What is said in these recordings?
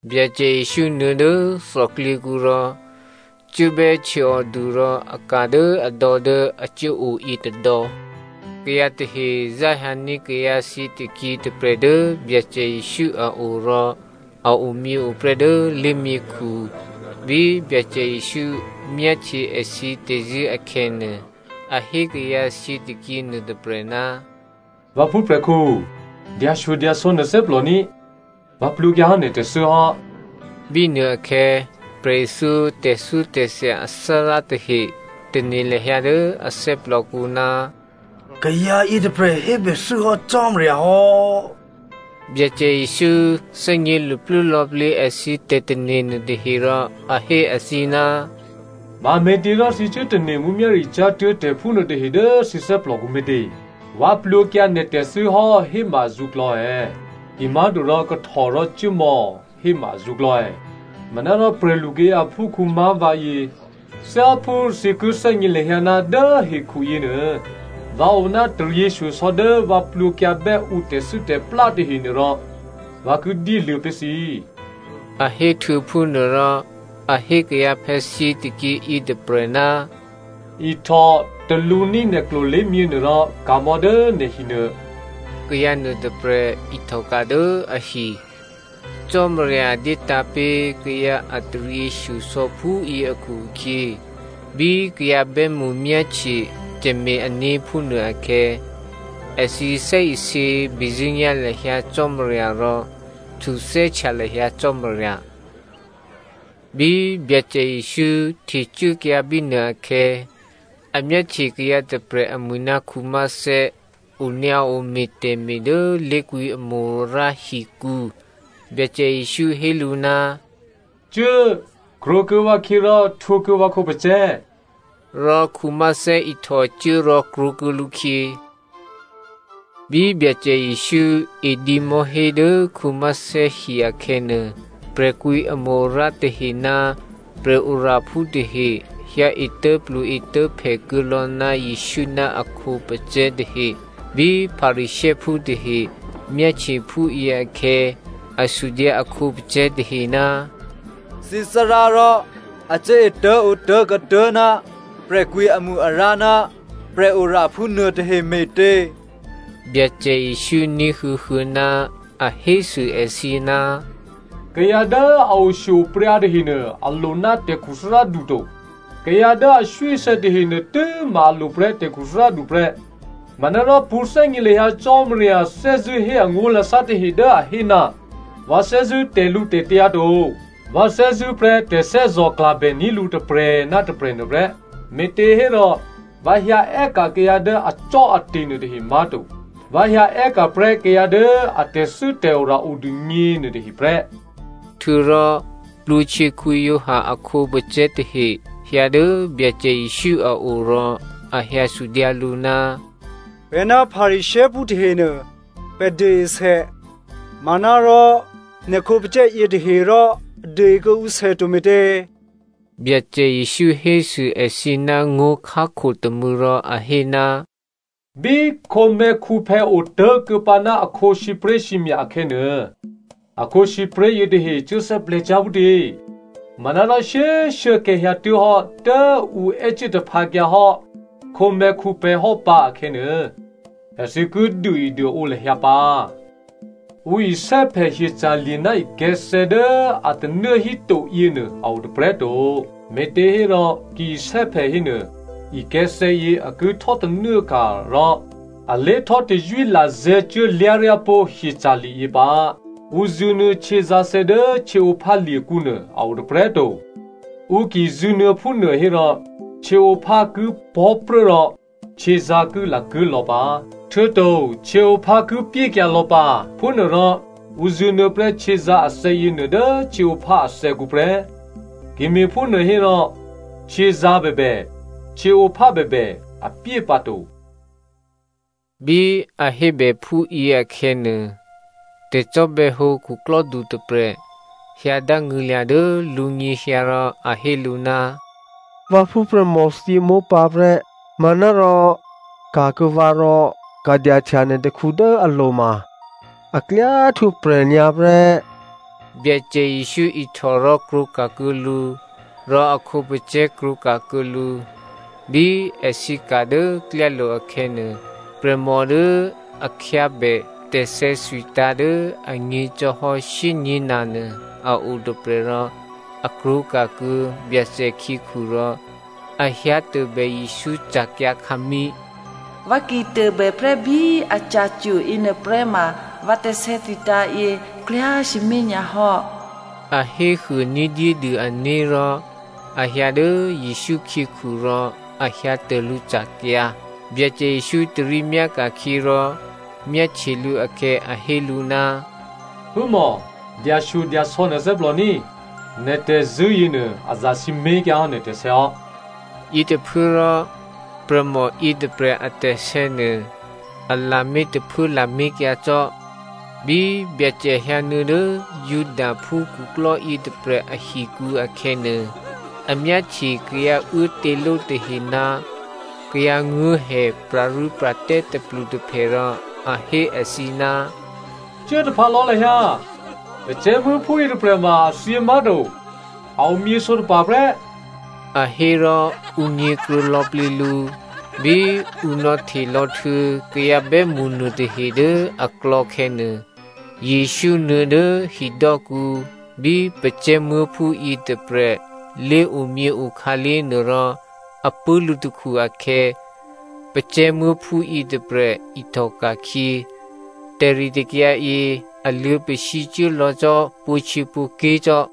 Byacè Jesǔ nuô̌ dố thòklyěkǔ rò cuốbè́ htyěòdu rò a ka̤ dố adò̌ dố a cuốo yětôdò̌. Kayǎ tahe záhyǎní̤ kayǎ thyětôkyě tôprè̤ dố Byacè Jesǔ a o rò a omyěo prè́ dố lé̤myěkhu. Bí Byacè Jesǔ myáhtye èthǐ tè̤zṳ̂́ akhè̌nuô, a hé kayǎ thyětôkyě nuôtôprè̤, “Vǎ phúprè̤khǔ꤮ dyashyodyasò̌ nè̤ thè́plò ní꤮. Vǎ plwǒkyǎhò́ nè̤ tè̤thû́ hò́.” Bínuôakhè̌ prè̤ithyó tè̤thyótè̤thya athárá tahe tane̤ lahyǎ dố a thè́plòkǔ, “Kayǎ yětôprè̤ hébèthû́ hò́ Cò́marya hò́.” Byacè Jesǔ thè́gně luplú lò̌plǐ èthǐ tè̤tane̤ nuôtahe rò a hé èthǐ, “Mame̤těrò thǐ cuố tane̤ mǔmyá̤ricyá̤ tuố̤ tè̤phúnuô tahe dố thǐ thè́plòkǔ me̤tě? ‘Vǎ plwǒkyǎ nè̤ tè̤thû́ hò́’ héma azǔklò̌ è̌? Kimá̤torò ‘Kahtò rò cuốmò̌’ héma azǔklò̌ è̌? Manárò prè̤lukayǎ aphúkhǔ má̤ vǎyě, thyáphú thǐ ki thè́gně lahyǎ ná dố hekhu yěnuô, vǎ o ná taryěshyosò̌ dố vǎ plwǒkyǎbè́ ǔ tè̤thû́tè̤plá tahenuôrò, vǎ ki dyéluô̌ pé̤ thǐ,” a hé htuô̌phúnuôrò, a hé kayǎphè̌ thyětôkyě yětôprè̤, “Ihtò talǔní̤ nè̤ klolé̤myě nuôrò ka̤mò̌ dố nè̤ hinuô.” Kayǎ nuôtôprè̤ ihtòka̤ dố ahi. Cò́marya dyétǎ̤pé̤ kayǎ a taryěshyosò̌ phúyě akhu-akhyě, bí kayǎ bè́mṳ myáhtye tè̤me̤-ané̤ phúnuô akhè̌, èthǐ thè́isě bezṳ̂́nyá̤ lahyǎ Cò́marya rò htuthè́htya lahyǎ Cò́marya. Bí Byacè Jesǔ htecuốkyǎ bínuôakhè̌, a myáhtye kayǎ tôprè̤ amwi̤ ná Matteo onyǎo me̤ tè̤me̤ dố lé̤kwǐ amo-arǎ hikǔ. Byacè Jesǔ hé lǔ, “Cuố꤮, krwǒkuô̌ vǎkhyě rò htwǒkuô̌ vǎ khǒpacè̤̌.” Rò Matteo ihtòcuố rò krwǒkuô̌ lǔkhyě. Bí Byacè Jesǔ edǐ mò̤́hé dố Matteo hi akhè̌nuô, prè̤kwǐamo-arǎ tahe ná prè̤oraphú tahe hyǎ etố̤plu-etố̤phè kuô̌lò̌ ná Jesǔ ná a khǒpacè̤̌ tahe. Bí Pharisěophú tahe myáhtye phúyě akhè̌, a sudyǎ a khǒpacè̤̌ tahe, “Thǐ Thárá rò a cuố etố̤ǒtố̤ kuô̌tuố̤ ná prè̤kwǐamo-arǎ ná prè̤tè̤oraphú nuôtahe me̤tě?” Byacè Jesǔ ní̤huô̌huô̌ ná a hésû èthǐ, “Kayǎ dố a oshyo-opryǎ tahenuô, a lo ná tè̤khuthárádu to. Kayǎ dố aswíasè̌ tahenuô tû́ma a lo prè́ tè̤khuthárádu prè́. Manárò pṳ̌thè́gně lahyǎ Cò́marya thè́zṳ̂́ hé angó̤lasá tahe dố a hé, ‘Vǎ thè́zṳ̂́ tè̤lǔtè̤tyǎ to, vǎ thè́zṳ̂́prè́ tè̤thè́zò̤klabè ní̤ lǔ tôprè̤ ná tôprè̤ nuôprè́.’ Me̤těhérò, vǎ hyǎ è́ka̤ kayǎ dố acò́ate̤ nuôtahe má̤to. Vǎ hyǎ è́ka̤prè́ kayǎ dố a tè̤thû́tè̤ora odûgně nuôtahe prè́.” Htuô̌rò Giovanni Baptista a khǒpacè̤̌ tahe hyǎ dố Byacè Jesǔ a o rò a hyǎ sudyǎ lǔ, “Pè̤ ná Pharisěophú tahenuô, pè̤ duôesè, manárò nè̤ khǒpacè̤̌ yětahe rò a duôe kuô̌ǔ sè to me̤tě?” Byacè Jesǔ hésû èthǐ ná ngó̤khákho tômû̌ rò a hé, “Bí khǒmè̤̌khǔphè̌ otố̤kuô̌pǎ ná akhǒ sǐpré̤sǐmya̤ akhè̌nuô, a khǒsǐpré̤ yětahe cuốthè́plè̤̌ cyá̤ phútě? Manárò shyé꤮ shuốkhè̌ hyǎtuố̤hò́ dố ǔ è́cuố taphǎkyǎhò́ khǒmè̤̌khǔphè̌ hò́pǎ akhè̌nuô, èthǐ ki duôeduôǒ lahyǎ pǎ. “Ǔ isè́phè hyeca̤lye̤ ná ikè̤̌thè̌ dố a tanuố hítoyě nuô a o tôprè̤꤮ to, me̤těhérò ki isè́phè hénuô ikè̤̌thè̌yě a ki htò́tanuốka̤ rò a lé htò́tazwí lazè̤̌ cuốlyá̤ryá pó̤ hyeca̤lye̤yě pǎ. Ǔ zṳ̂nuô̌ htyězǎ̤thè̌ dố htyěǒphálye̤kǔ nuô a o tôprè̤꤮ to. Ǔ ki zṳ̂nuô̌ phúnuô hérò, htyěǒphá ki pò̤́pruố rò htyězǎ̤ ki lakuố̤lò̌ pǎ. Htuô̌to htyěǒphá ki pyékyǎ lò̌ pǎ. Phúnuôrò ǔ zṳ̂nuô̌ prè́ htyězǎ̤ athè̌ yěnuô dố htyěǒphá athè̌kǔ prè́. Ki me̤phúnuô hérò htyězǎ̤ bèbè, htyěǒphá bèbè, a pyé pǎ to.” Bí a hébè ǔ phúyě akhè̌nuô, tè̤cò́bè̌hǒ khuklò́du tôprè̤ hyǎ dángṳ̂lya̤ dố lǔnyěhyǎ rò a hé lǔ, “Vǎ phúprè̤mò thyěmópǎprè́, manárò ka̤kuô̌ vǎ rò ka̤dyahtya nè̤ takhu dố alo̤ ma a klyá htwǒprè̤ nyǎ prè́.” Byacè Jesǔ ihtò rò krwǒka̤kuô̌ lǔ. Rò a khǒpacè̤̌ krwǒka̤kuô̌ lǔ. Bí èthǐ ka̤ dố klyálo̤ akhè̌nuô, prè̤mò dố a khyábè tè̤sè̌thwitǎ̤ dố anyě̤ cò́hò́ shyényě̤na nuô a o tôprè̤, rò a krwǒka̤kuô̌ Byacè khyěkhu rò a hyǎ tôbè Jesǔ ca̤kyǎkhǎmí̤. “Vǎ ki tôbè prè́bí aca̤cwo̤ yěnuôprè́ ma vǎ tè̤sè̌thwitǎ̤ yě klyá sǐmé̤ nyǎ hò́,” a hé huô ní̤dyédû ané̤ rò a hyǎ dố Jesǔ khyěkhu rò a hyǎ tô lǔ ca̤kyǎ. Byacè Jesǔ tarí myáka̤khyě rò myáhtye lǔ akhè̌ a hé lǔ, “Phúmò, dyashyodyasò̌ nè̤ thè́plò ní꤮, nè̤ tè̤zṳ̂́ yěnuô, a zasǐmé̤ kyǎhò́ nè̤ tè̤sè̌hò́.” Yětôphuốrò prè̤mò yětôprè̤ a tè̤sè̌nuô, a lamé̤ tôphuố lamé̤kyǎ cò́. Bí Byacè hyǎnuô̌ dố Judaphú khuklò́ yětôprè̤ ahikǔ akhè̌nuô, a myáhtye kayǎ uốtěló tahe ná kayǎ nguố̤hè pra̤rû́pra̤tè́ tôplutôphè rò a hé èthǐ, “Cuốtaphǎ lò̌ lahyǎ. Pacè̤̌muố̤phú yětôprè̤ ma a thyě má̤to, a omyě sǒtapa̤ prè́.” A hé rò ǔ nyě̤kruô̌ lò̌plǐ lǔ. Bí ǔ nò̌htelò̌ htuô̌ kayǎ bè́mṳ nuôtahe dố aklò̌ khè̌nuô, Jesǔ nuô̌ dố hidò́kǔ bí pacè̤̌muố̤phú yětôprè̤ lé̤omyěo khǎlé̤ nuô rò a pṳ̂́ lǔtakhu akhè̌ pacè̤̌muố̤phú yětôprè̤ ihtòka̤khyě. Tè̤ritè̤kyǎ yě a luô̌ pasǐ cuốlò̌ cò́ pwǒ̤htyěpwǒ̤ké̤ cò́.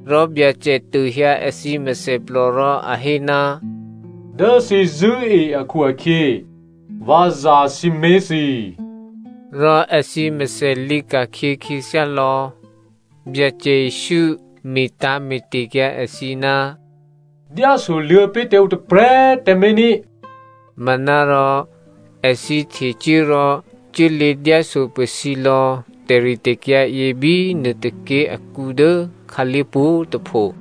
Rò Byacè tôhyǎ èthǐ mèthèplò rò a hé, “Dố thǐ zṳ̂́e akhu-akhyě, vǎ zasǐmé̤ thǐ.” Rò èthǐ mèthè lǐka̤khyě khyěthyá lò̌. Byacè Jesǔ metǎ̤mete̤kyǎ èthǐ, “Dyásoluô̌ pé̤ tǎ ǔ tôprè̤꤮ tǎmé̤ ní꤮.” Manárò èthǐ htecuố rò cuốlě dyáso pasǐlò̌ tè̤ritè̤kyǎ yě bí nuôtôké̤ akǔ dố khǎlé̤ pwǒ̤꤮ tôpho.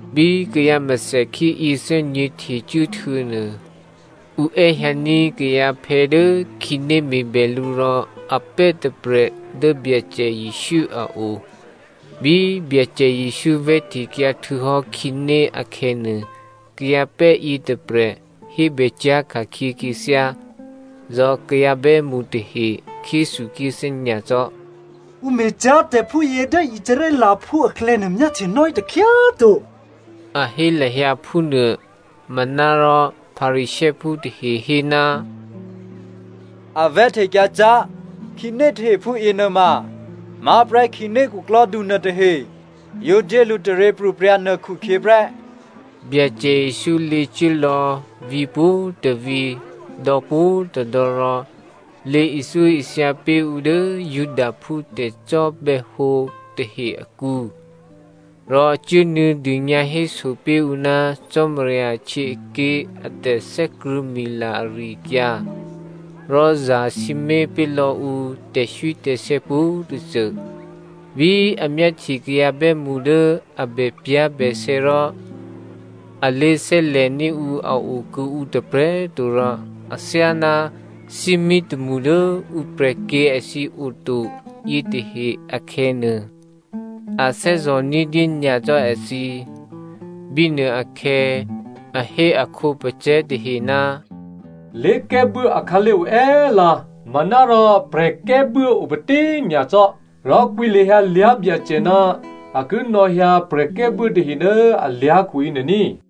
Bí kayǎ mèthèkhí yěthè́nyě̤ htecuố htuô̌nuô, ǔ è́hyǎní̤ kayǎphè̌ dố khǐné me̤bè lǔ rò a pè́ tôprè̤ dố Byacè Jesǔ a o. Bí Byacè Jesǔ vè̤́htekyǎ htuô̌hò́ khǐné akhè̌nuô, kayǎpè́ yětôprè̤ hébè cyá̤ ka̤khyě khyěthyá. Rò kayǎ bè́mṳ tahe khyéthukhyéthè́ nyacò́. “Ǔ me̤cyá̤ tè̤ phúyě dố Israelphú aklè̌nuô myáhtye nò́hí takhyá꤮ to,” a hé lahyǎ phúnuô. Manárò, Pharisěophú tahe hé, “A vè̤́htekyǎ cyá̤ khǐné tahe phúyě nuôma má̤prè́ khǐné khuklò́du nuôtahe yǒ dyé lǔ taryěpro̤prya̤ nuô khukhyě prè́.” Byacè Jesǔ lě cuốlò̌ vǐ̤ pwǒ̤tôvǐ̤ dò̌ pwǒ̤꤮ tôdò̌ rò lě ithyóithya pé̤ ǔ dố Judaphú tè̤cò́bè̌hǒ tahe akǔ, rò cuốnuô̌ dônyǎhéso pé̤ ǔ ná Cò́marya ahtyěaké̤ a tè̤thè́krṳ̂̌mila ari-akyǎ, rò zasǐmé̤ pé̤ lò̌ ǔ tè̤swítè̤sè̌ pwǒ̤tôcô. Bí a myáhtye kayǎ bè́mṳ dố a bèpyá̤bèsè̌ rò a lé̤thè́lè̤ní̤ ǔ a o kuô̌ǔ tôprè̤꤮ to rò athyáná thímí tômṳ dố ǔ prè̤kyě̤ èthǐ oto yětahe akhè̌nuô, a thè́zò̤ ní̤dyé nyacò́ èthǐ. Bínuôakhè̌, a hé a khǒpacè̤̌ tahe, “Lé̤kè́buố akhǎlé̤ oè́lǎ, manárò prè̤kè́buố opatí꤮ nyacò́. Rò kwǐ lahyǎ lyá̤byacè ná a ki nò̌hyǎ prè̤kè́buố tahe dố alyá̤khu yěnuô ní꤮.”